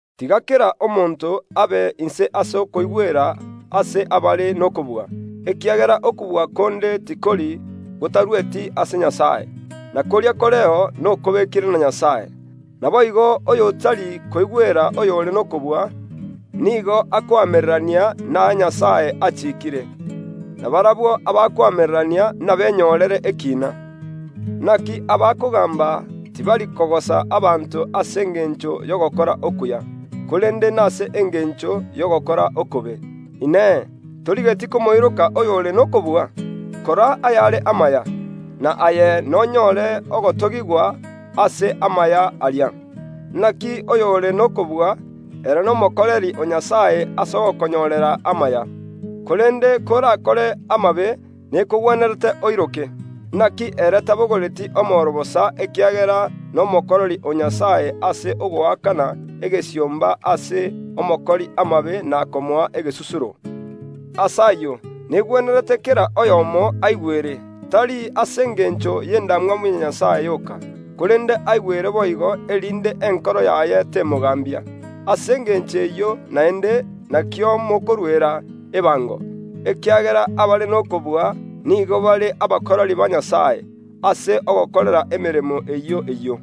Tiga kera omonto abe omoigweri ase abare n’okobua, ekiagera okobua konde tikori gotarueti ase Nyasae, na koria koreo nokobekire na Nyasae. Naboigo oy’otari koigwera oyore n’okobua, nigo akoamererania naya Nyasae achiikire; na barabwo abakoamererania inabenyorere ekiina. Inaki abakogaamba tibari kogosa abanto ase engencho y’ogokora okuya, korende nase engencho y’ogokora okobe. Inee! Torigeti komoiroka oyore n’okobua? Kora ayare amaya, na aye nonyore ogotogigwa ase amaya aria. Inaki oyore n’okobua, ere n’omokoreri o Nyasae ase ogokonyorera amaya. Korende korakore amabe nekogwenerete oiroke; inaki ere tabogoreti omoro bosa, ekiagera n’omokoreri o Nyasae ase ogoakana egesiomba ase omokori amabe na komoa egesusuro. Ase ayio negwenerete kera oyomo aigwere, tari ase engencho y ’endamwamu ya Nyasae yoka, korende aigwere boigo, erinde enkoro yaye temogaambia. Ase engencho eyio naende nakio mokoruera ebango, ekiagera abare n’okobua nigo bare abakoreri ba Nyasae, ase ogokora emeremo eyio eyio.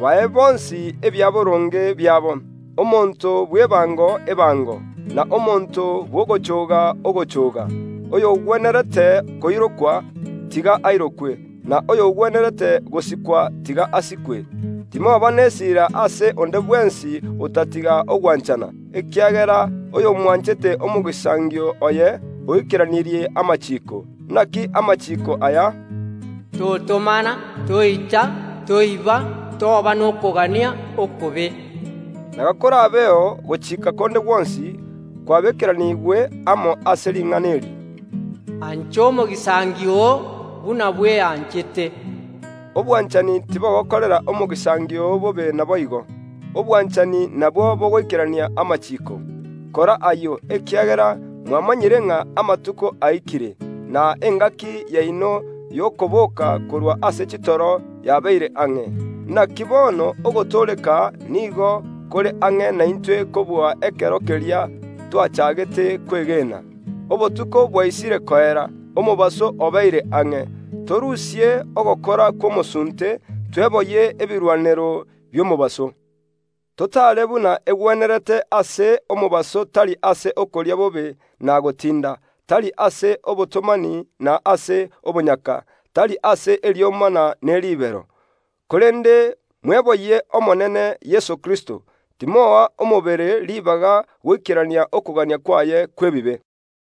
Bae bonsi ebiaboronge biabo: omonto bw’ebango, ebango; na omonto bw’ogochooga, ogochooga; oyogwenerete koirokwa, tiga airokwe; na oyogwenerete gosikwa, tiga asikwe. Timoba n’esira ase onde bwensi otatiga ogwanchana, ekiagera oy’omwanchete omogisangio oye oikeranirie amachiiko. Inaki amachiiko aya, “Totomana, Toita, Toiba, Toba nokogania okobe”, na gakorabeo gochiika konde gwonsi, kwabeekeraniigwe amo ase ring’ana eri, “Ancha omogisangio oo buna bweanchete.” Obwanchani tibogokorera omogisangio oo bobe; naboigo, obwanchani nabwo bogoikerania amachiiko. Kora ayio, ekiagera mwamanyire ng’a amatuko aikire, na engaki yaino y’okoboka korwa ase chitoro yabeire ang’e. Inaki bono ogotooreka nigo kore ang’e naintwe kobua ekero keria twachaagete kwegena. Obotuko bwaisire koera, omobaso obeire ang’e. Torusie ogokora kw’omosunte; tweboyie ebirwanero bi’omobaso. Totaare buna egwenerete ase omobaso; tari ase okoria bobe na gotinda, tari ase obotomani na ase obonyaka, tari ase eriomana ne ribero. Korende mweboyie Omonene Yeso Kristo, timoa omobere ribaga goikerania okogania kwaye kw’ebibe.